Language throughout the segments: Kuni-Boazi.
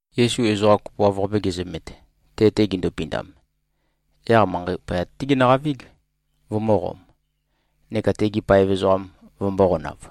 Yesu ezoqa kopoav-qape gezømet, te-te gindupindam, yaq manqei poyat-té genøqavíg, vømø̄qom, neka tegi paev ezoqam vømbō-qonav.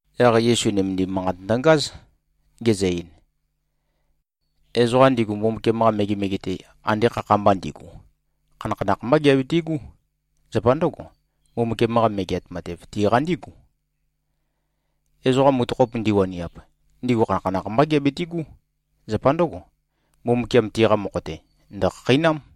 Yaq Yesu nømendim manqat ndøngáz, gezø-ein, “Ezoqa ndigu, Mbumbukiam-qa megemege-te, ande khakha-mba ndigu, khanakhanakh mbá giabitigú. Zapa ndǿgo, Mbumbukiam-qa Megeat Matev, tiqa ndígu. Ezoqa mutøkhop ndiwaniap, ndigu khanakhanakh mbá giabitigú. Zapa ndǿgo, Mbumbukiam tiqa mokho-te ndø̀khakheinám.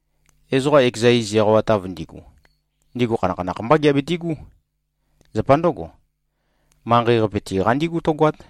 Ezoqa ekeza iz eqawatav ndigu, ndigu khanakhanakh mbá giabitigú. Zapa ndǿgo, manqei-qape tiqa ndígu tǿgoát.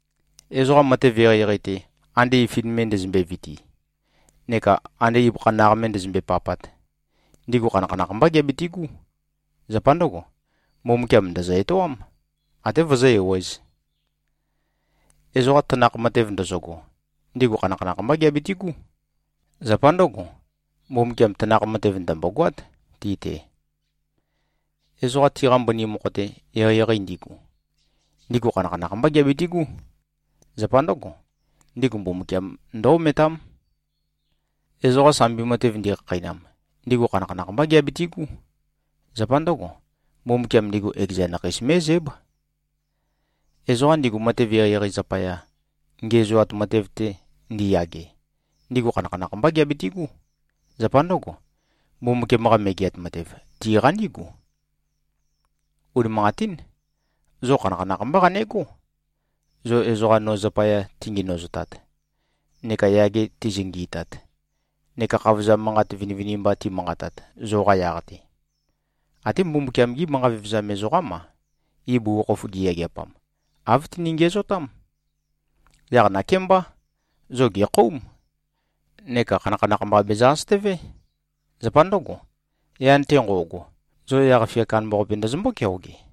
Ezoqa matev eqeieqei-te, ande ifin me ndøzømbe-viti neka ande ibøkha naq me ndøzømbe-papat, ndigu khanakhanakh mbá giabitigú. Zapa ndǿgo, Mbumbukiam ndø̀zø-etoám, ate vøzǿ-ewēz. Ezoqa tanakh matev ndøzøgo, ndigu khanakhanakh mbá giabitigú. Zapa ndǿgo, Mbumbukiam tanakh matev ndø̀mbogoát ti-te. Ezoqa tiqa mbøni mokho-te, eqeieqei ndigu, ndigu khanakhanakh mbá giabitigú. Zapa ndǿgo, ndigu Mbumbukiam ndǿ-ometám. Ezoqa sambi matev ndikhakheinam, ndigu khanakhanakh mbá giabitigú. Zapa ndǿgo, Mbumbukiam ndigu ekeza nakhei mé꞉zǽb. Ezoqa ndigu matev eqeieqei zapaya, ngiæzoat matev-te ndiyage, ndigu khanakhanakh mbá giabitigú. Zapa ndǿgo, Mbumbukiam-qa Megeat Matev, tiqa ndígu. Unimanqatín. Zo khanakhanakh mbá qanegó, zo ezoqa no zapaya tingenøzotat neka yage tizøngi꞉tat neka khavozam manqat vinivinimba timanqatat, zoqa yaq-te. Até Mbumbukiam-gí manqa vevezam ezoqám-a, ibugukhokhof giyageapam, āv tini-ngiæzotám. Yaq nakémbá, zo gèkhóum neka khanakhanakh mba bezø-asøtøvé. Zapa ndǿgo, yan-te nqo꞉go, zo yaq-fia kandambaqape ndøzømbó-keoge.”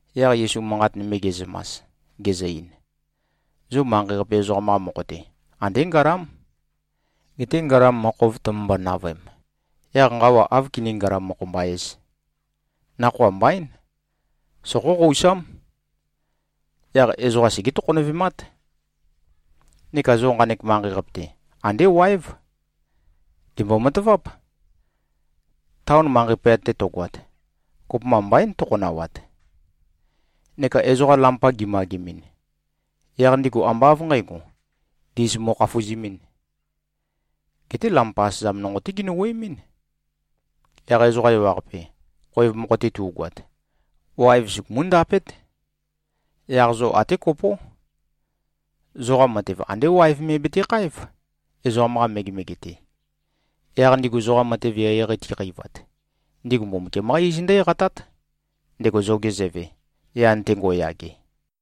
Yaq Yesu manqat nøme ge꞉zømas, gezø-ein, “Zo manqei-qape ezoqam-qa mokho-te, andé ngalám. Geté ngalam mokhov tømømbo-navøem, yaq nqawa áv kiní-ngalam-mokho-mba-ēz? Nakhoa mbaín. Soqóqousám. Yaq ezoqa segé-tokhonøvemát. Neka zo nqanek manqei-qape-te, andé wáev. Gèmbo-mataváp. Taon manqei poyat-te to꞉goat, kopømba mbaín tøkhonawat. Neka ezoqa lampa gimagemɨn, yaq ndigu ambá av nqǣgo, ndis mo꞉khafuzimīn. Geté lampa asøzam nonqo-té ginø-wuøemín. Yaq ezoqa ewaqape, khoev mokho-te tu꞉goat, waev sugumú-ndapét. Yaq zo até kopó. Zoqa matev andé waev me betekháev, ezoqam-qa megemege-te. Yaq ndigu zoqa matev eqeieqei tiqeivat, ndigu Mbumbukiam-qá iz ndǿ-eqatát, ndego zoge Zøve, yan-te ngo꞉yage.”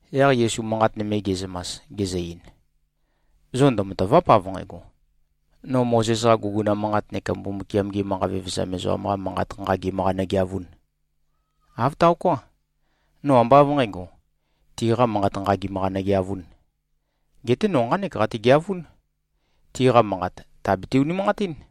Yaq Yesu manqat nøme ge꞉zømas, gezø-ein, “Zo ndømatàva᷄p av nqægo, no Mozes-qa guguna manqat neka Mbumbukiam-gi manqa vevezam ezoqam-qa manqat nqagim-qa nøgeavūn. Āv taoká. No ambá av nqǣgo, tiqa manqat nqagim-qa nøgeavūn. Geté no nqánek qategeavún: Tiqa manqat tàbete-unimanqatín.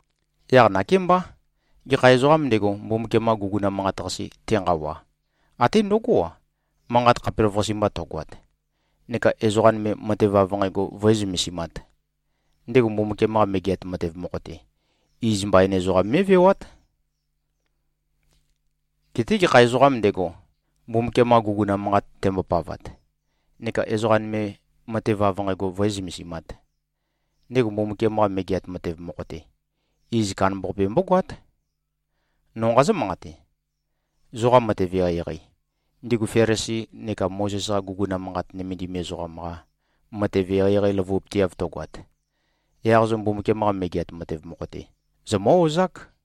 Yaq nakémbá. Gekha ezoqām ndego, Mbumbukiam-qa guguna manqat-qase tenqawa, até ndøgó-a, manqat khapelavøqase mba tøgoat, neka ezoqa nøme matev av nqægo vǿe-zømesimāt, ndego Mbumbukiam-qa Megeat Matev mokho-te, iz mbain ezoqam mé꞉vewát. Geté gekha ezoqām ndego, Mbumbukiam-qa guguna manqat tembopavat, neka ezoqa nøme matev av nqægo vǿe-zømesimāt, ndego Mbumbukiam-qa Megeat Matev mokho-te, iz kandambaqape mbógoát. No nqazǿ-manqate: Zoqa matev eqeieqei, ndigu Felisi neka Mozes-qa guguna manqat nømendim ezoqam-qa matev eqeieqei løvupøteav tøgoat, yaq zo Mbumbukiam-qa Megeat Matev mokho-te zomǿ-ozák.”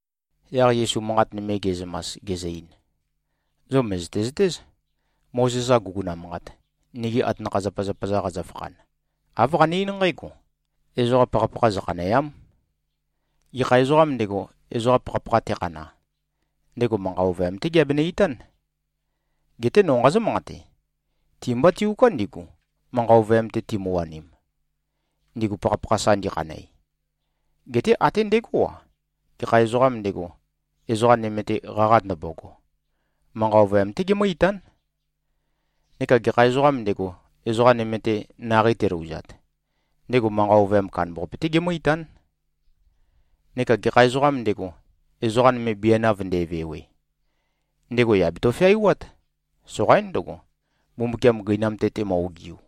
Yaq Yesu manqat nøme ge꞉zømas, gezø-ein, “Zo mø̀zøte-zøtéz, Mozes-qa guguna manqat, nigi atanakha-zapazapa-za qazøfakhan, āv qane-eín nqǽgo, ‘Ezoqa pakhapakha zøkhanèa᷄m. Gekha ezoqām ndego, ezoqa pakhapakha tekhana, ndego manqa ovøyam-té geabenø-itán.’ Geté no nqazǿ-manqate: Ti-mbá tiuká ndigu, manqa ovøyam-te timøwanim, ndigu pakhapakha sa ndikhanæ. Geté até ndegó-a, gekha ezoqām ndego, ezoqa nøme-te qaqa ndømbogo, manqa ovøyam-té gemǿ-itán. Neka gekha ezoqām ndego, ezoqa nøme-te naqei telouzat, ndego manqa ovøyam kandambaqape-té gemǿ-itán. Neka gekha ezoqām ndego, ezoqa nøme bianav nde꞉vewe, ndego yà beto-feaiwát. Soqaín ndøgo, Mbumbukiam gøinam-te temø-ogiu.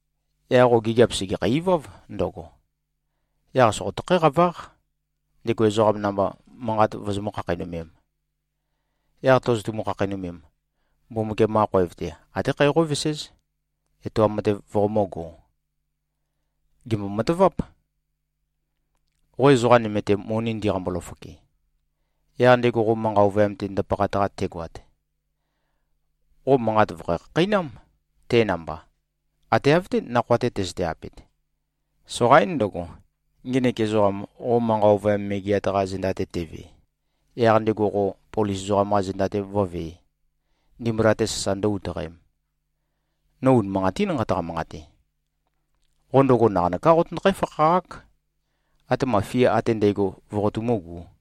yaq qo gigiap sègekhæ-iváv ndøgo. Yaq soqotøkhǽ-qaváq, ndego ezoqam namba manqat vozomǿ-khakheinømēm. Yaq tozotumu-khakheinømem, Mbumbukiam-qa khoev-te, até khæ qóveséz, etoam matev voqomǿgō. Gèmbo-mataváp. Qo ezoqa nøme-te moni ndiqambo-løfoke, yaq ndego qo manqa ovøyam-te ndapaqat-qa tegoat, qo manqat vø̀kho-khakheinám, te namba, ate av-té nakhoa-te tøzøte-apet. Soqaín ndøgo, ngenek ezoqam qo manqa ovøyam megeat-qa zenda-te teve, yaq ndego qo polis ezoqam-qa zenda-te vǿvē, ndimbula-te sasa ndǿ-utøqēm. No unimanqatín nqataqa-manqate. Qo ndøgo naqanøká qotøndøkhǽ-fakhaqák, atema fia ate ndægo voqotumúgū.”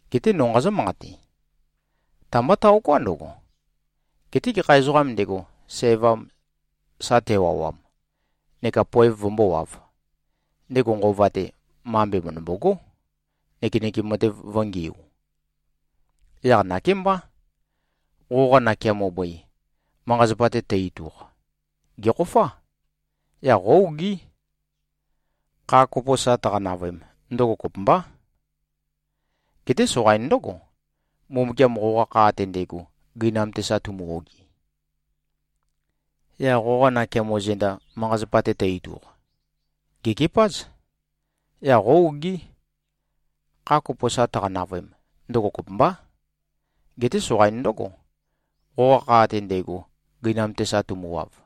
Geté no nqazǿ-manqate: Ta-mbá taoká ndøgo. Geté gekha ezoqām ndego, sævam sa tewawam, neka poev vømbówāv, ndego nqova-te, mambe mø̀ndømbogó, nøkenøkem matev vø̄ngiu. Yaq nakémbá, qoqa nakeamo bøi, manqa-zapa-te tø-ituq, gèkhofá. Yaq qó-ogí. Kha kopo sa tøqa-navøem, ndøgo kopømbá. Geté soqain ndǿgo, Mbumbukiam qoqa kha ate ndægo gøinam-te sa tumu-ogi. Yaq qoqa nakeamo zenda, manqa-zapa-te tø-ituq, gèkepáz. Yaq qó-ogí. Kha kopo sa tøqa-navøem, ndøgo kopømbá. Geté soqain ndǿgo, qoqa kha ate ndægo gøinam-te sa tømuwav.”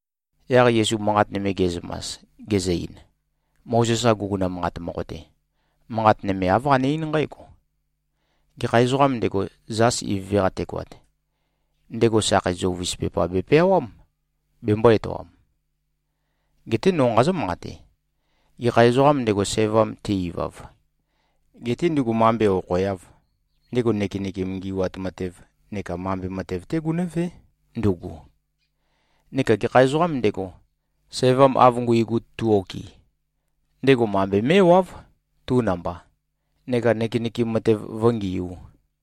Yaq Yesu manqat nøme ge꞉zømas, gezø-ein, “Mozes-qa guguna manqat mokho-te, manqat nøme āv qane-eín nqǽgo, ‘Gekha ezoqām ndego, zas ivøve-qa tegoat, ndego sakhei zøuvis pepa bepeawám, bembō-etoam.’ Geté no nqazǿ-manqate: Gekha ezoqām ndego, sævam te-ivav, getē ndugu mambe okhoeāv, ndego nøkenøkem ngi꞉wat matev neka mambe matev-té gunǿvé, ndugu. Neka gekha ezoqām ndego, sævam av nguigu tu-okɨ, ndego mambe mé꞉wáv, tu namba, neka nøkenøkem matev vǿngiū.”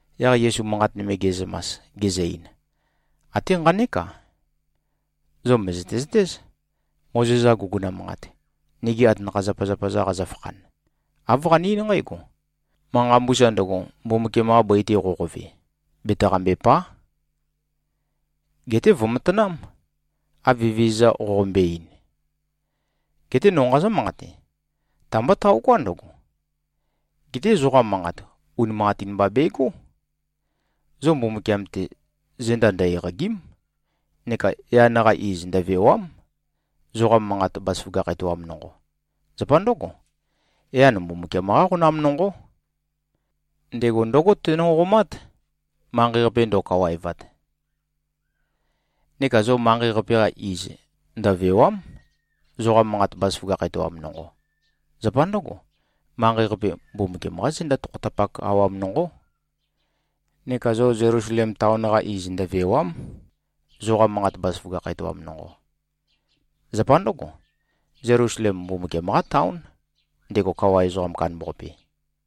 Yaq Yesu manqat nøme ge꞉zømas, gezø-ein, “Até nqanék-a, zo mø̀zøte-zøtéz. Mozes-qa guguna manqat, nigi atanakha-zapazapa-za qazøfakhan, āv qane-eín nqǽgo, ‘Manqa mbusa ndøgo, Mbumbukiam-qa bøi-te qoqove, betaqambèpa᷄. Geté vø̀matanám, av Evezøza qoqombøe-ein.’ Geté no nqazǿ-manqate: Ta-mbá taoká ndøgo. Geté zoqa manqat, unimanqatin mba begó. Zo Mbumbukiam-te zenda ndø-eqàgi᷄m neka yan-qa iz ndøvèwa᷄m, zoqa manqat bazaføgakh etoam nonqo. Zapa ndǿgo, yan Mbumbukiam-qá qonam nonqó. Ndego ndǿgo teno꞉qomát, manqei-qape ndo꞉kawaevat. Neka zo manqei-qape-qa iz ndøvèwa᷄m, zoqa manqat bazaføgakh etoam nonqo. Zapa ndǿgo, manqei-qape, Mbumbukiam-qá zenda tokhotapak awam nonqó. Neka zo Zelusalem taon-qa iz ndøvèwa᷄m, zoqa manqat bazaføgakh etoam nonqo. Zapa ndǿgo, Zelusalem, Mbumbukiam-qá taón, ndego Kawa Ezoqam Kandambaqape.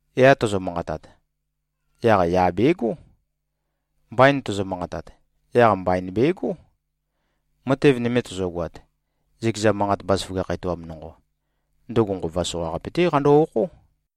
‘Ya’ tozo-manqatat, yaq ‘ya’ begó. ‘Mbain’ tozo-manqatat, yaq ‘mbain’ begó. Matev nøme tozogoat, zøkeza manqat bazaføgakh etoam nonqo, ndøgo nqova soqaqape-té qando-okhó.”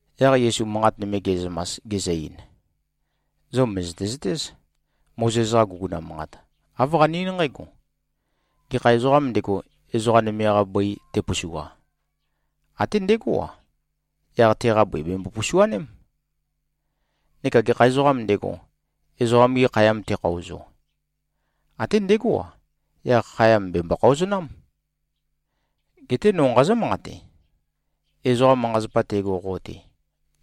Yaq Yesu manqat nøme ge꞉zømas, gezø-ein, “Zo mø̀zøte-zøtéz, Mozes-qa guguna manqat, āv qane-eín nqǽgo, ‘Gekha ezoqām ndego, ezoqa nøme-qa bøi tepusua, até ndegó-a, yaq teqa bøi bèmbo-pusuaném. Neka gekha ezoqām ndego, ezoqam-gi khayam tekhaozo, até ndegó-a, yaq khayam bèmbo-khaozonám.’ Geté no nqazǿ-manqate: Ezoqa manqa-zapa tego qo-te,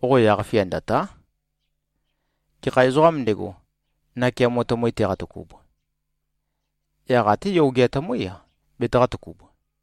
qo yaq-fia ndø̀ta᷄. Gekha ezoqām ndego, nakeamo tømøi teqatøkub, yaq até yogea tømǿi-a betaqā-tøkub.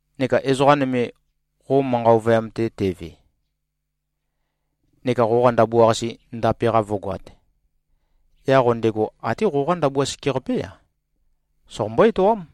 Neka ezoqa nøme, qo manqa ovøyam-te teve, neka qoqa ndabua-qase ndape-qa vǿgoāt, yaq qo ndego até qoqá ndabua sekeqapé-a, soqombó-etoám.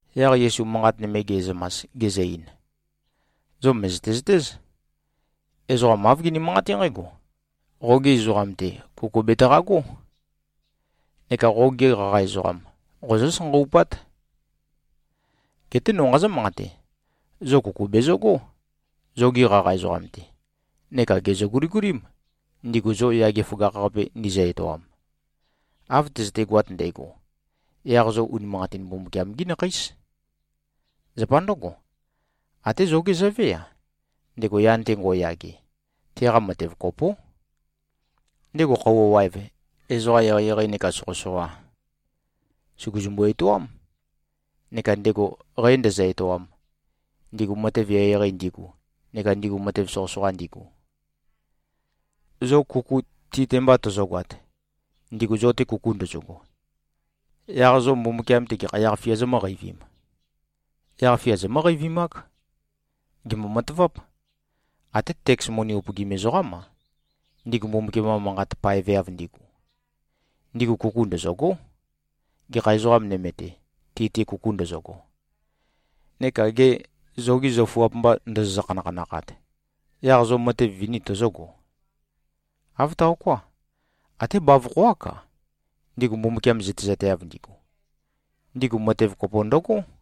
Yaq Yesu manqat nøme ge꞉zømas, gezø-ein, “Zo mø̀zøte-zøtéz, ezoqa āv gini-manqaté nqǽgo, ‘Qogi ezoqam-te, kuku betaqagó. Neka qogi qaqa ezoqam, qozǿ-sanqawupát.’ Geté no nqazǿ-manqate: Zo kuku bezøgó, zogi qaqa ezoqam-te. Neka gèzø-guligulím, ndigu zo yage føgakh-qape ndizø-etoam. Av tøzøtegoat ndægo, yaq zo unimanqatin Mbumbukiam-gí nakheís. Zapa ndǿgo, até zogé Zøvé-a, ndego yan-te ngo꞉yage, teqa matev kopó. Ndego khøuwa waev, ezoqa eqeieqei neka soqøsoqa, sùguzumbu-etoám, neka ndego qæ ndēzø̄-ētōām, ndigu matev eqeieqei ndigu neka ndigu matev soqøsoqa ndigu. Zo kuku ti-te mba tøzøgoat, ndigu zo-te kuku ndøzøgo, yaq zo Mbumbukiam-te gekha yaq-fia zomǿqeivīm? Yaq-fia zomǿ-qeivimák. Gèmbo-mataváp. Até teks moni upøgim ezoqám-a, ndigu Mbumbukiam-qa manqat paeveav ndigu, ndigu kuku ndøzø̂gó, gekha ezoqa nøme-te, ti-te kuku ndøzøgo. Neka gê, zogi zøfuap mba ndozozø-khanakhanakhat, yaq zo matev vini tozógo? Āv taoká. Até bavokho-ák-a, ndigu Mbumbukiam zøtezateav ndigu, ndigu matev kopo ndøgó.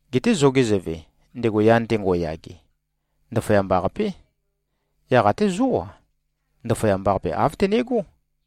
Geté zoge Zøve, ndego yan-te ngo꞉yage, ndaføyamba-qapé. Yaq até zó-a, ndaføyamba-qape āv tøne꞉gó.”